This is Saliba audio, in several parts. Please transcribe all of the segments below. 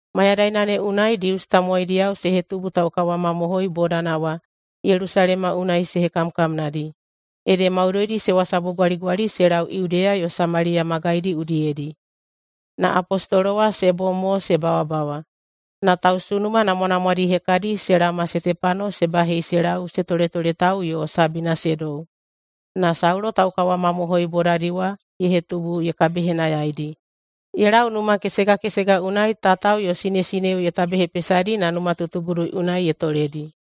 Mayadaina ne unai Dius tamowaidiyao se hetubu taukawamamohoi bodana wa Yelusalema unai se hekamkamnadi. Ede maudoidi se wasabugwaligwali se lau Yudeya yo Samaliya magaidi udiyedi, na apostolo wa se bom mo se bawabawa. Na tausunuma namwanamwadi hekadi se laoma Setepano se bahei se lau se toletoletau yo sabina se dou. Na Saulo taukawamamohoi bodadi wa ye hetubu ye kabihenayaidi. Ye lau numa kesega kesega unai tatao yo sinesineo ye tabehepesadi na numatutugudu unai ye toledi.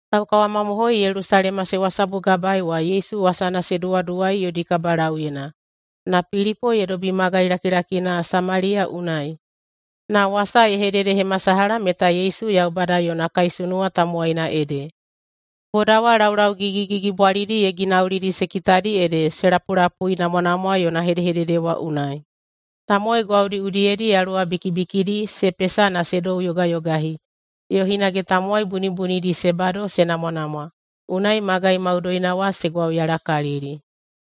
Taukawamamohoi Yelusalema se wasabugabaei wa Yesu wasana se duwaduwai yodi kabalauyena. Na Pilipo ye dobi magai lakilakina Samaliya unai, na wasa ye hededehemasalaha meta Yesu Yaubada yona kaisunuwa tamowaina ede. Boda wa laulau gigigigibwalidi ye ginaulidi se kitadi ede se lapulapuinamwanamwa yona hedehedede wa unai. Tamowai gwaudi udiyedi yaluwa bikibikidi se pesa na se douyogayogahi, yo hinage tamowai bunibunidi se bado se namwanamwa. Unai magai maudoina wa se gwauyalakalili.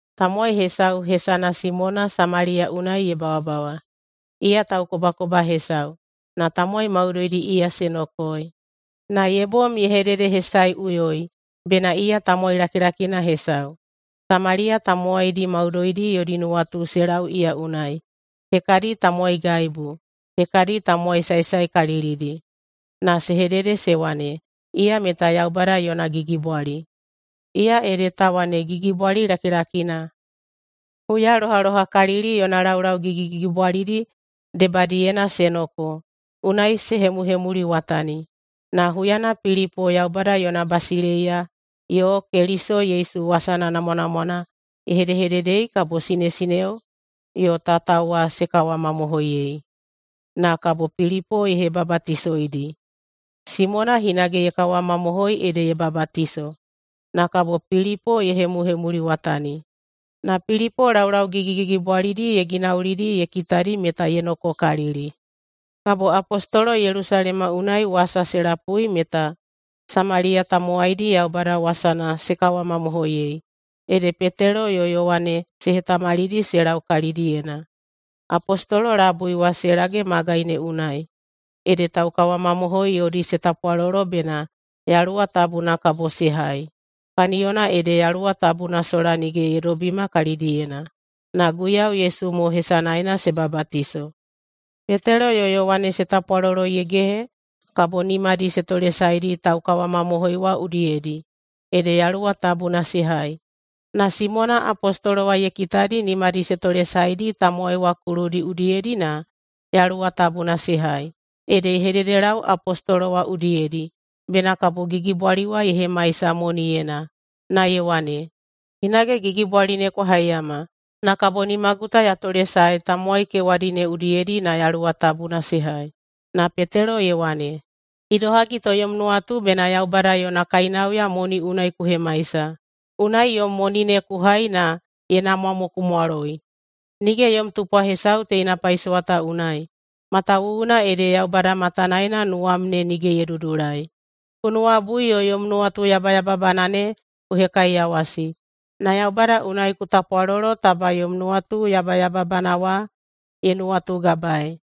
Tamowai hesau hesana Simona Samaliya unai ye bawabawa. Iya taukobakoba hesau, na tamowai maudoidi iya se nokoei. Na ye bom ye hededehesaeꞌuyoi bena iya tamowai lakilakina hesau. Samaliya tamowaidi maudoidi yodi nuwatu se lau iya unai, hekadi tamowaigaibu, hekadi tamowai saesaekalilidi, na se hedede se wane, “Iya meta Yaubada yona gigibwali, iya ede ta wane gigibwali lakilakina.” Huya lohalohakalili yona laulau gigigigibwalidi debadiyena se noko, unai se hemuhemuliwatani. Na huyana Pilipo Yaubada yona basileiya yo Keliso Yesu wasana namwanamwana ye hedehededei kabo sinesineo yo tatao wa se kawamamohoiyei, na kabo Pilipo ye hebabatisoidi. Simona hinage ye kawamamohoi ede ye babatiso. Na kabo Pilipo ye hemuhemuliwatani, na Pilipo laulau gigigigibwalidi ye ginaulidi ye kitadi meta ye nokokalili. Kabo apostolo Yelusalema unai wasa se lapui meta Samaliya tamowaidi Yaubada wasana se kawamamohoiyei, ede Petelo yo Yowane se hetamalidi se lau kalidiyena. Apostolo labui wa se lage magai ne unai, ede taukawamamohoi yodi se tapwalolo bena Yaluwa Tabuna kabo se hai. Kaniyona ede Yaluwa Tabuna sola nige ye dobima kalidiyena, na Guiyau Yesu mo hesanaena se babatiso. Petelo yo Yowane se tapwalolo ye gehe, kabo nimadi se tolesaedi taukawamamohoi wa udiyedi, ede Yaluwa Tabuna se hai. Na Simona apostolo wa ye kitadi nimadi se tolesaedi tamowai wa kuludi udiyedi na Yaluwa Tabuna se hai, ede ye hededelau apostolo wa udiyedi bena kabo gigibwali wa ye hemaisa moniyena, na ye wane, “Hinage gigibwali ne kwa haiyama, na kabo nimagu ta ya tolesae tamowai kewadi ne udiyedi na Yaluwa Tabuna se hai.” Na Petelo ye wane, “Idohagi to yom nuwatu bena Yaubada yona kainauya moni unai ku hemaisa. Unai yom moni ne ku hai na ye namwa mo ku mwaloi! Nige yom tupwa hesau teina paisowa ta unai, matawuwuna ede Yaubada matanaena nuwam ne nige ye dudulai. Ku nuwabui yo yom nuwatu yabayababana ne ku hekaiyawasi, na Yaubada unai ku tapwalolo taba yom nuwatu yabayababana wa ye nuwatugabaei.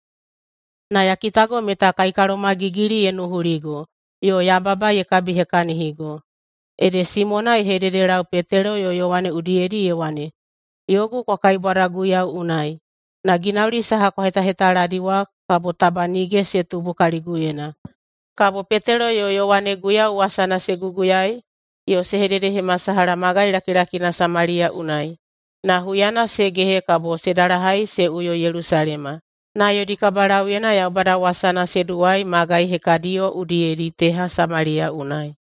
Na ya kitago meta kaikalomagigili ye nuhuligo, yo yababa ye kabihekahinigo.” Ede Simona ye hedehededelau Petelo yo Yowane udiyedi ye wane, “Yogu kwa kaibwada Guiyau unai, na ginauli saha kwa hetahetaladi wa kabo taba nige se tubu kaliguyena.” Kabo Petelo yo Yowane Guiyau wasana se guguyaei yo se hededehemasalaha magai lakilakina Samaliya unai, na huyana se gehe kabo se dalahai se uyo Yelusalema, na yodi kabalauyena Yaubada wasana se duwai magai hekadiyo udiyedi teha Samaliya unai.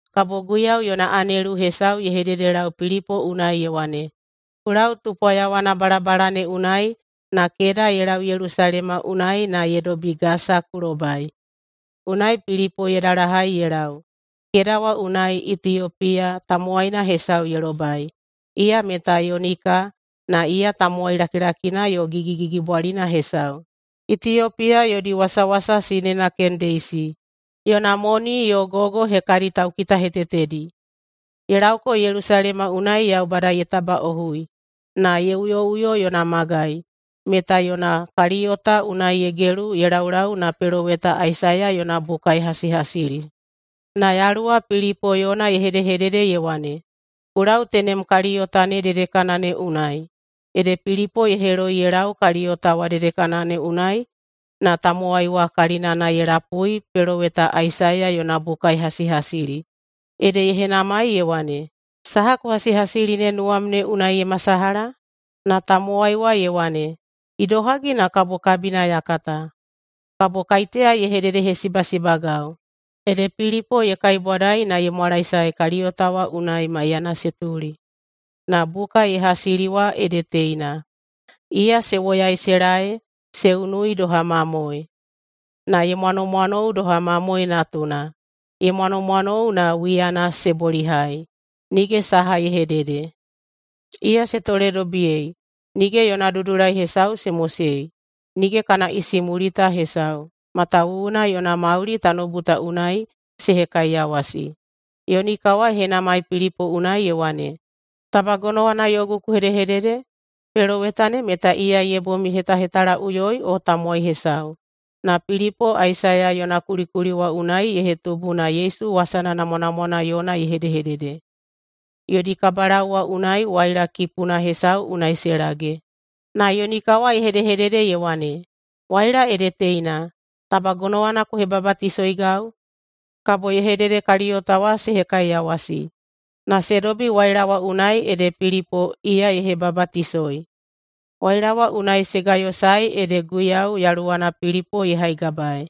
Kabo Guiyau yona anelu hesau ye hededelau Pilipo unai ye wane, “Ku lau tupwa yawana balabala ne unai na keda ye lau Yelusalema unai na ye dobi Gasa ku lobai.” Unai Pilipo ye dalahai ye lau. Keda wa unai Itiyopiya tamowaina hesau ye lobai. Iya meta yunika, na iya tamowai lakilakina yo gigigigibwalina hesau, Itiyopiya yodi wasawasa sinena Kendeisi yona moni yo gogo hekadi taukitahetetedi. Ye lauko Yelusalema unai Yaubada ye tabaꞌohui, na ye uyoꞌuyo yona magai, meta yona kaliyota unai ye gelu ye laulau na peloweta Aisaiya yona buka ye hasihasili. Na Yaluwa Pilipo yona ye hedehedede ye wane, “Ku lau tenem kaliyota ne dedekana ne unai.” Ede Pilipo ye heloi ye lau kaliyota wa dedekana ne unai, na tamowai wa kalinana ye lapui peloweta Aisaiya yona buka ye hasihasili. Ede ye henamai ye wane, “Saha ku hasihasili ne nuwam ne unai ye masalaha?” Na tamowai wa ye wane, “Idohagi na kabo kabina ya kata? Kabo kaiteya ye hededehesibasibagau?” Ede Pilipo ye kaibwadai na ye mwalaesae kaliyota wa unai maiyana se tuli. Na buka ye hasili wa ede teina: Iya se woyai se laei se unui doha mamoe, na ye mwanomwanou doha mamoe natuna ye mwanomwanou na wiyana se bolihai, nige saha ye hedede. Iya se toledobiyei, nige yona dudulai hesau se mosei. Nige kana isimulita hesau, matawuwuna yona mauli tanoubu ta unai se hekaiyawasi. Yunika wa ye henamai Pilipo unai ye wane, “Taba gonowana yogu ku hedehedede? Peloweta ne meta iya ye bom ye hetahetalaꞌuyoi o tamowai hesau?” Na Pilipo Aisaiya yona kulikuli wa unai ye hetubu na Yesu wasana namwanamwana yona ye hedehedede. Yodi kabalau wa unai waila kipuna hesau unai se lage. Na yunika wa ye hedehedede ye wane, “Waila ede teina. Taba gonowana ku hebabatisoigau?” Kabo ye hedede kaliyota wa se hekaiyawasi. Na se dobi waila wa unai ede Pilipo iya ye hebabatisoi. Waila wa unai se gayosae ede Guiyau Yaluwana Pilipo ye haigabai.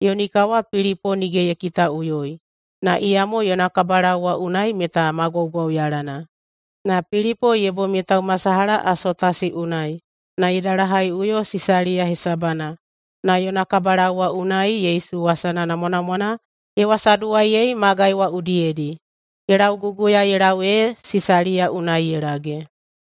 Yunika wa Pilipo nige ye kitaꞌuyoi, na iyamo yona kabalau wa unai meta ma gwaugwauyalana. Na Pilipo ye bom ye taumasalaha Asotasi unai na ye dalahaiꞌuyo Sisaliya hesabana na yona kabalau wa unai Yesu wasana namwanamwana ye wasaduwaiyei magai wa udiyedi. Ye lauguguya ye lau ee Sisaliya unai ye lage.